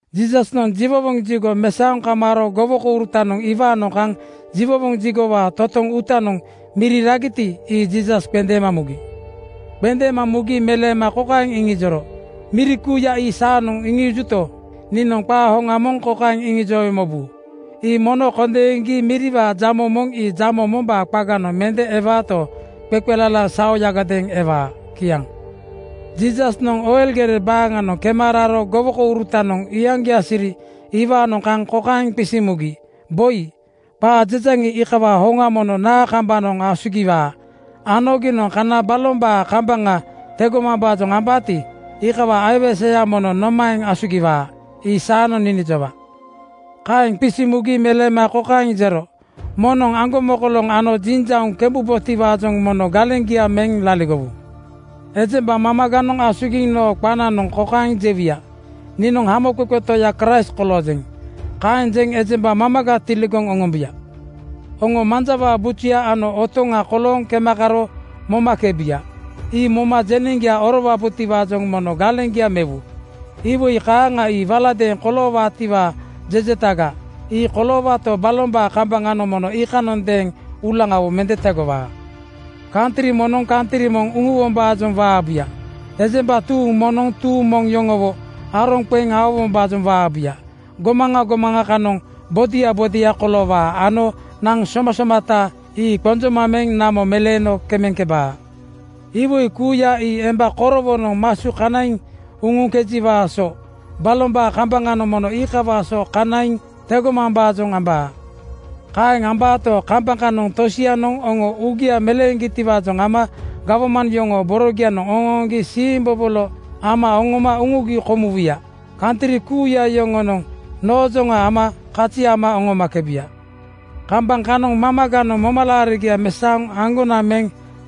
Jiisasnoŋ jiwowoŋ jigo mesaoŋ kamaaro gowokourutanoŋ iwaanoŋ kaŋ jiwowoŋ jigowaa totoŋ uutanoŋ miri ragiti, ii Jiisas qendeema mugi. Qendeema mugi meleema kokaeŋ iŋijoro, “Miri kuuya ii saanoŋ iŋiijuto, niinoŋ qaa hoŋa moŋ kokaeŋ iŋijowe mobu: Ii mono kondeeŋgi miriwaa jamo moŋ ii jamo mombaa qaganoŋ mende ewaato, qeqelala saoyagadeeŋ ewaa.” Kiaŋ. Jiisasnoŋ Oil gere baaŋanoŋ kema raro gowokourutanoŋ iyaŋgia siri iwaanoŋ kaŋ kokaeŋ qisiŋ mugi, “Boi, qaa jejaŋi, iikawaa hoŋa mono naa kambanoŋ asugiwaa ano giinoŋ kana balombaa kambaŋa tegomambaajoŋ ambaati, iikawaa aiweseyanoŋ mono nomaeŋ asugiwaa? Ii saanoŋ ninijowa.” Kaeŋ qisiŋ mugi meleema kokaeŋ jero: “Moŋnoŋ aŋgomokoloŋ ano jiŋjauŋ kembubotiwaajoŋ mono galeŋgia meŋ laligowu. Ejemba mamaganoŋ asugiŋ noo qananoŋ kokaeŋ jewuya, ‘Niinoŋ Hamoqeqe Toya Kraist koloojeŋ.’ Kaeŋ jeŋ ejemba mamaga tiligoŋ oŋombuya. Oŋo manjawaa bujuya ano otoŋa kolooŋ kema karo momakebuya. Ii moma jeneŋgia orowabotiwaajoŋ mono galeŋgia mewu. Iwoi kaaŋa ii waladeeŋ koloowaatiwaa jejetaga. Ii koloowaato, balombaa kambaŋanoŋ mono iikanondeeŋ uulaŋawo mende tegowaa. “Kantri moŋnoŋ kantri moŋ uŋuwombaajoŋ waabuya. Ejemba tuuŋ moŋnoŋ tuuŋ moŋ yoŋowo aroŋ qeŋ aowombaajoŋ waabuya. Gomaŋa gomaŋa kanoŋ bodia bodia koloowaa ano naŋ somasomata ii qonjoma meŋ namo meleeno kemeŋkebaa. Iwoi kuuya ii emba korowonoŋ masu kanaiŋ uŋuŋkejiwaa so. Balombaa kambaŋanoŋ mono iikawaa so kanaiŋ tegomambaajoŋ ambaa. “Kaeŋ ambaato, kambaŋ kanoŋ tosianoŋ oŋo uugia meleeŋgitiwaajoŋ ama gawman yoŋoo boronoŋ oŋooŋgi siimbobolo ama oŋoma uŋugi komuwuya. Kantri kuuya yoŋonoŋ noojoŋa ama kazi ama oŋomakebu. Kambaŋ kanoŋ mamaganoŋ momalaarigia mesaoŋ aŋgonaŋ meŋ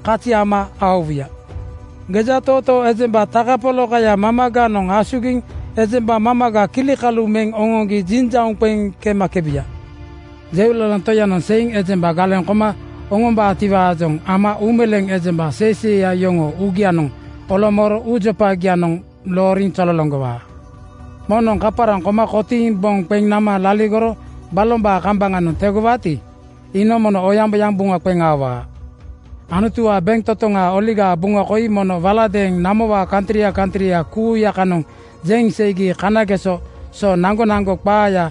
kazi ama aowuya. Gejatootoo ejemba takapolakaya mamaganoŋ asugiŋ ejemba mamaga kilikalu meŋ oŋoŋgi jiŋjauŋ qeŋ kemakebuya. “Jeulalaŋ Toyanoŋ seiŋ ejemba galeŋ koma oŋombaatiwaajoŋ ama uumeleeŋ ejemba seiseiya yoŋoo uugianoŋ olomooro uujopagianoŋ looriŋ zololoŋgowaa. Moŋnoŋ kaparaŋ koma kotiiŋ boŋ qeŋ nama laligoro balombaa kambaŋanoŋ tegowaati, iinoŋ mono oyaŋboyaŋ buŋa qeŋ aowaa. Anutuwaa bentotoŋaa Oligaa Buŋa koi mono waladeeŋ namowaa kantria kantria kuuya kanoŋ jeŋ seigi kanageso so naŋgonaŋgo qaaya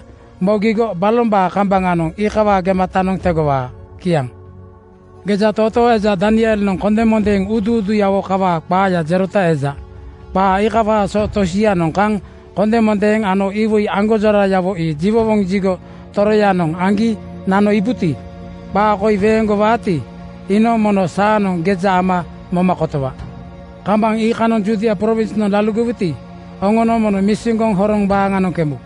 mogigo balombaa kambaŋanoŋ iikawaa gematanoŋ tegowaa. Kiaŋ. “Gejatootoo eja Danielnoŋ kondemondeeŋ uuduuduyawo kawaa qaaya jerota eja. Qaa iikawaa so tosianoŋ kaŋ kondemondeeŋ ano iwoi aŋgonjorayawo ii jiwowoŋ jigo toroyanoŋ aŋgi nano iibuti, qaa koi weeŋgowagati, iinoŋ mono saanoŋ geja ama moma kotowa. Kambaŋ iikanoŋ Judia prowinsnoŋ laligowuti, oŋonoŋ mono misiŋgoŋ horoŋ baaŋanoŋ kembu.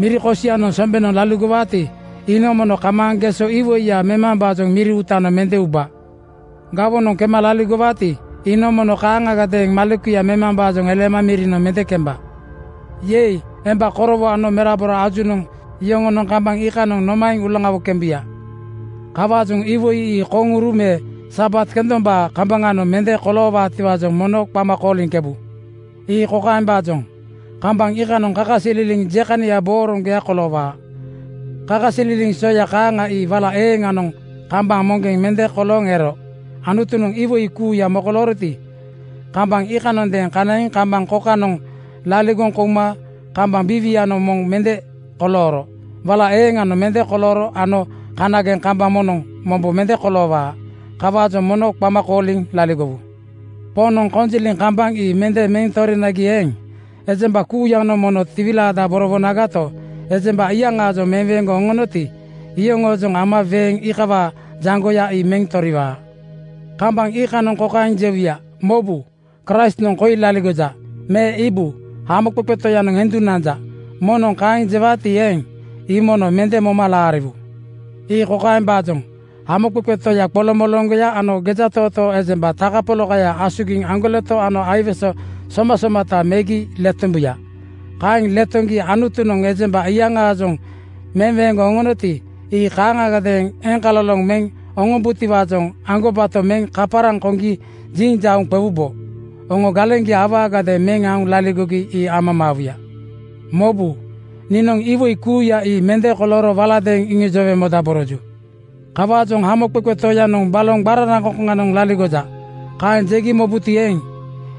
Miri kosianoŋ sombenoŋ laligowaati, iinoŋ mono kamaaŋ geso iwoiya memambaajoŋ miri uutanoŋ mende uba. Gawonoŋ kema laligowaati, iinoŋ mono kaaŋagadeeŋ malekuya memambaajoŋ eleema mirinoŋ mende kemba. “Yei! Emba korowo ano merabora ajunoŋ yoŋonoŋ kambaŋ iikanoŋ nomaeŋ uulaŋawo kembuya? Kawaajoŋ iwoi ii koŋuru me Sabat kendombaa kambaŋanoŋ mende koloowaatiwaajoŋ mono qama kooliŋkebu. “Ii kokaembaajoŋ: Kambaŋ iikanoŋ kakasililiŋ jekania booroŋgoya koloowaa. Kakasililiŋ soya kaaŋa ii wala eeŋanoŋ kambaŋ moŋgeŋ mende kolooŋ ero. Anutunoŋ iwoi kuuya mokolooroti, kambaŋ iikanondeeŋ kanaiŋ kambaŋ kokanoŋ laligoŋ kouma kambaŋ biiwianoŋ moŋ mende kolooro. Wala eeŋanoŋ mende kolooro ano kanageŋ kambaŋ moŋnoŋ mombo mende koloowaa. Kawaajoŋ mono qama kooliŋ laligowu. Poŋnoŋ kokojinjiŋ kambaŋ ii mende meŋ torinagati eeŋ, ejemba kuuyanoŋ mono tiwilaadaborowuyagato, ejemba iyaŋaajoŋ meweeŋgoŋ oŋonoti, iyoŋoojoŋ ama weeŋ iikawaa jaŋgoya ii meŋ toriwaa. “Kambaŋ iikanoŋ kokaeŋ jewuya, ‘Mobu! Kraistnoŋ koi laligoja,’ me ‘Iibu! Hamoqeqe Toyanoŋ endu nanja.’ Moŋnoŋ kaeŋ jewaati eeŋ, ii mono mende moma laariwu. Ii kokaembaajoŋ: Hamoqeqe toya qoloŋmoloŋgoya ano gejatootoo ejemba takapolakaya asugiŋ aŋgoleto ano aiwese somasomata megi letombuya. Kaeŋ letoŋgi Anutunoŋ ejemba iyaŋaajoŋ meweeŋgoŋ oŋonoti, ii kaaŋagadeeŋ eŋkaloloŋ meŋ oŋombutiwaajoŋ aŋgobato meŋ kaparaŋ koŋgi jiŋjauŋ qewubo. Oŋo galeŋgia awaagadeeŋ meŋ aoŋ laligogi ii amamaawuya. Mobu! Niinoŋ iwoi kuuya ii mende kolooro waladeeŋ iŋijowe modaboroju. “Kawaajoŋ ‘Hamoqeqe Toyanoŋ baloŋ qararaŋkoŋkoŋanoŋ laligoja,’ kaeŋ jegi mobuti eeŋ,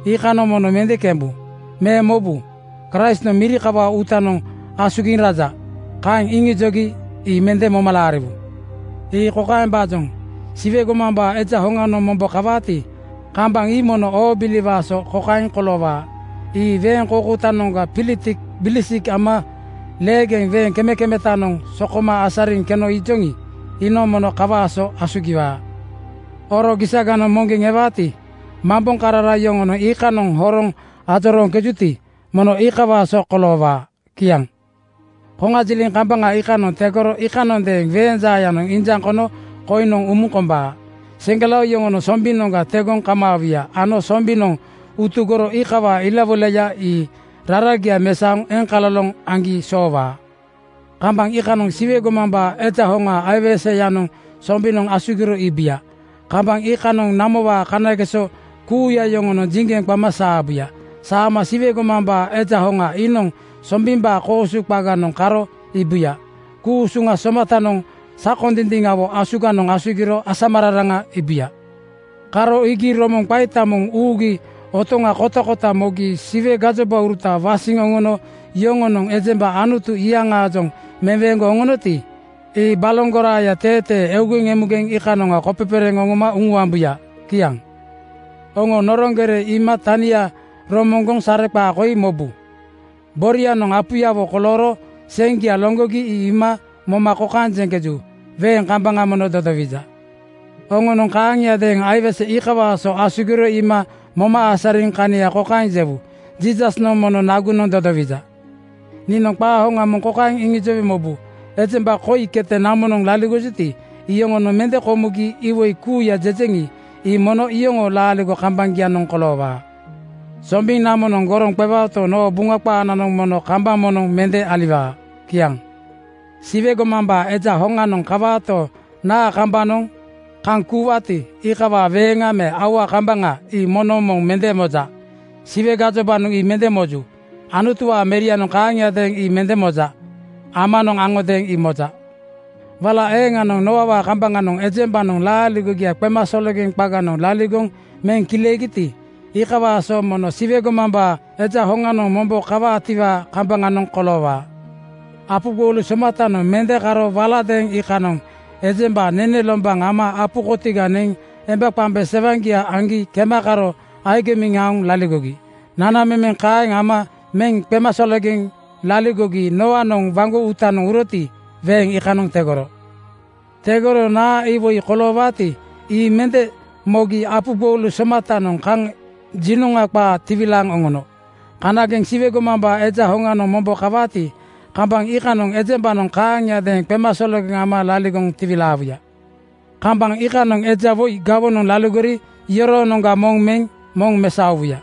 iikanoŋ mono mende kembu. Me ‘Mobu! Kraistnoŋ miri kawaa uutanoŋ asugiŋ raja,’ kaeŋ iŋijogi ii mende moma laariwu. Ii kokaembaajoŋ: Siwe gomambaa Eja hoŋanoŋ mombo kawaati, kambaŋ ii mono oobiliwaa so kokaeŋ koloowaa: Ii weeŋ koukoutanoŋga pilitik bilisik ama leegeŋ weeŋ kemekemetanoŋ sokoma asariŋ keno iijoŋi, iinoŋ mono iikawaa so asugiwaa. “Oro gisaganoŋ moŋgeŋ ewaati, mamboŋkarara yoŋonoŋ iikanoŋ horoŋ ajorooŋkejuti, mono iikawaa so koloowaa.” Kiaŋ “Koŋajiliŋ kambaŋ iikanoŋ tegoro iikanondeeŋ weeŋ jaayanoŋ injaŋ kono koiŋnoŋ umuŋ kombaa. Seŋgelao yoŋonoŋ sombinoŋga tegoŋ kamaawuya ano sombinoŋ utugoro iikawaa ilawoilaya ii raragia mesaoŋ eŋkaloloŋ aŋgi soowaa. Kambaŋ iikanoŋ Siwe gomambaa Eja hoŋaa aiweseyanoŋ sombinoŋ asugiro iibuya. Kambaŋ iikanoŋ namowaa kanageso kuuya yoŋonoŋ jiŋgeŋ qama saabuya. Saama Siwe gomambaa Eja hoŋa iinoŋ sombimbaa koosu qaganoŋ karo iibuya. Ku-usuŋa somatanoŋ sakondindiŋawo asuganoŋ asugiro asamararaŋa iibuya. Karo iigi romoŋ qaita moŋ uugi otoŋa kotakota mogi Siwe gajobauruta wasiŋ oŋono yoŋonoŋ ejemba Anutunoŋ iyaŋaajoŋ meweeŋgoŋ oŋonoti, ii baloŋ goraaya teetee eugeŋ emugeŋ iikanoŋa kopepereeŋ oŋoma uŋuambuya. Kiaŋ “Oŋo noroŋ gere iima tania romoŋgoŋ sareqaa koi mobu. Borianoŋ apuyawo kolooro seŋgia loŋgogi ii iima moma kokaeŋ jeŋkeju, ‘Weeŋ kambaŋa mono dodowija.’ Oŋonoŋ kaaŋiadeeŋ aiwese iikawaa so asugiro iima moma asariŋ kania kokaeŋ jewu, ‘Jiisasnoŋ mono nagunoŋ dodowija.’ “Niinoŋ qaa hoŋa moŋ kokaeŋ iŋijowe mobu: Ejemba koi kete namonoŋ laligojuti, iyoŋonoŋ mende komugi iwoi kuuya jejeŋi, ii mono iyoŋoo laaligo kambaŋgianoŋ koloowaa. Sombiŋ namonoŋ goroŋ qewaoto, noo Buŋa qaananoŋ mono kambaŋ moŋnoŋ mende aliwaa. Kiaŋ. “Siwe gomambaa Eja hoŋanoŋ kawaato, naa kambanoŋ kaŋ kuuwaati, iikawaa weeŋa me aua kambaŋa ii moŋnoŋ moŋ mende moja. Siwe gajobanoŋ ii mende moju. Anutuwaa Merianoŋ kaaŋagadeeŋ ii mende moja. Amanoŋ aŋodeeŋ ii moja. Wala eeŋanoŋ Nooawaa kambaŋanoŋ ejembanoŋ laaligogia qemasologeŋ qaganoŋ laligoŋ meŋ kileegiti, iikawaa so mono Siwe gomambaa Eja hoŋanoŋ mombo kawaatiwaa kambaŋanoŋ koloowaa. “Apu gboulu somatanoŋ mende karo waladeeŋ iikanoŋ ejemba nene lombaŋ ama apu kotiga neŋ embaqemba sewaŋaajoŋ aŋgi kema karo agimiŋ aoŋ laligogi. Nanamemeŋ kaeŋ ama meŋ qemasologeŋ laligogi Nooanoŋ waŋgo uutanoŋ uroti, weeŋ iikanoŋ tegoro. Tegoro naa iwoi koloowaati, ii mende mogi apu gboulu somatanoŋ kaŋ jinoŋa qaa tiwilaaŋ oŋono. Kanageŋ Siwe gomambaa Eja hoŋanoŋ mombo kawaati, kambaŋ iikanoŋ ejembanoŋ kaaŋiadeeŋ qemasologeŋ ama laligoŋ tiwilaawuya. “Kambaŋ iikanoŋ eja woi gawonoŋ laligori yoroonoŋga moŋ meŋ moŋ mesaowuya.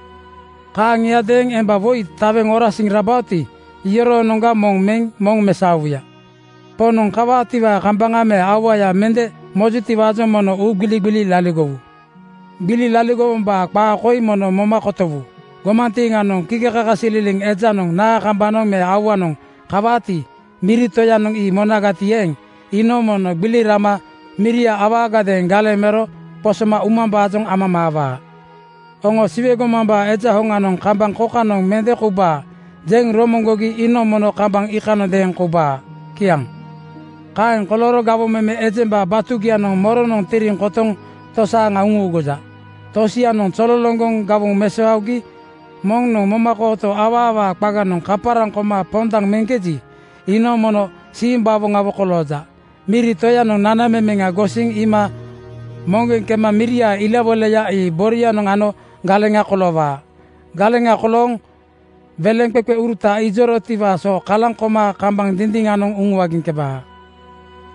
Kaaŋiadeeŋ emba woi taweŋ orasiŋ rabaoti, iyoroonoŋga moŋ meŋ moŋ mesaowuya. “Poŋnoŋ kawaatiwaa kambaŋa me auaya mende mojutiwaajoŋ mono uugbiligbili laligowu. Gbili laligowombaa qaa koi mono moma kotowu: Gomantiiŋanoŋ kikekakasililiŋ ejanoŋ naa kambanoŋ me auanoŋ kawaati, miri toyanoŋ ii monagati eeŋ, iinoŋ mono gbili rama miria awaagadeeŋ galeŋ mero qosoma umambaajoŋ amamaawaa. Oŋo ‘Siwe gomambaa Eja hoŋanoŋ kambaŋ kokanoŋ mende koubaa,’ jeŋ romoŋgogi iinoŋ mono kambaŋ iikanondeeŋ koubaa. Kiaŋ. “Kaeŋ kolooro gawoŋ meme ejemba batugianoŋ moronoŋ tiriŋ kotoŋ tosaaŋa uŋuuguja? Tosianoŋ zololoŋgoŋ gawoŋ mesaogi moŋnoŋ momakooto awaawaa qaganoŋ kaparaŋ koma pondaŋ meŋkeji, iinoŋ mono simbawoŋawo kolooja. Miri toyanoŋ nanamemeŋa gosiŋ iima moŋgeŋ kema miriaa ilawoilaya ii borianoŋ ano galeŋa koloowaa. Galeŋa kolooŋ weleŋqeqeuruta ijorotiwaa so kalaŋ koma kambaŋ dindiŋanoŋ uŋuagiŋkebaa.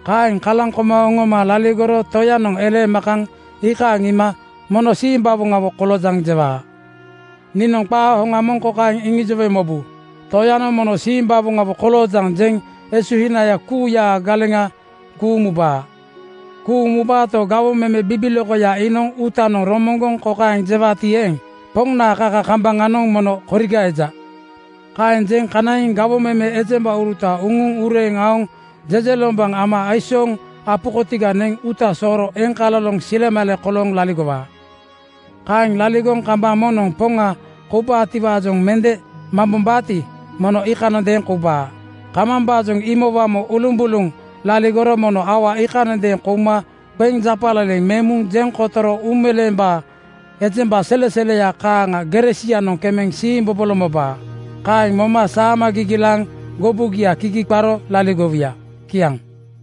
Kaeŋ kalaŋ koma oŋoma laligoro toyanoŋ eleema kaŋ iikaaŋ iima ‘Mono simbawoŋawo koloojaŋ!’ jewaa. “Niinoŋ qaa hoŋa moŋ kokaeŋ iŋijowe mobu: Toyanoŋ ‘Mono simbawoŋawo koloojaŋ!’ jeŋ esuhinaya kuuyaa galeŋa kuuŋ mubaa. Kuuŋ mubaato, gawoŋ meme bibilokoya iinoŋ uutanoŋ romoŋgoŋ kokaeŋ jewaati eeŋ, ‘Poŋnaa kaka kambaŋanoŋ mono koriga eja.’ Kaeŋ jeŋ kanaiŋ gawoŋ meme ejembauruta uŋuŋ ureeŋ aoŋ jejelombaŋ ama aisooŋ apu kotiga neŋ uuta sooro eŋkaloloŋ silemale kolooŋ laligowaa. “Kaeŋ laligoŋ kambaŋ moŋnoŋ poŋa koubaatiwaajoŋ mende mambombaati, mono iikanondeeŋ koubaa. Kambambaajoŋ imowamo ulumbuluŋ laligoro mono aua iikanondeeŋ kouma qeŋ japaleleŋ meŋ muŋ jeŋ kotoro uumeleembaa ejemba seleseleya kaaŋa gere sianoŋ kemeŋ siimbobolo mobaa. Kaeŋ moma saama gigilaaŋ gobugia kigi qaro laligowuya.” Kiaŋ.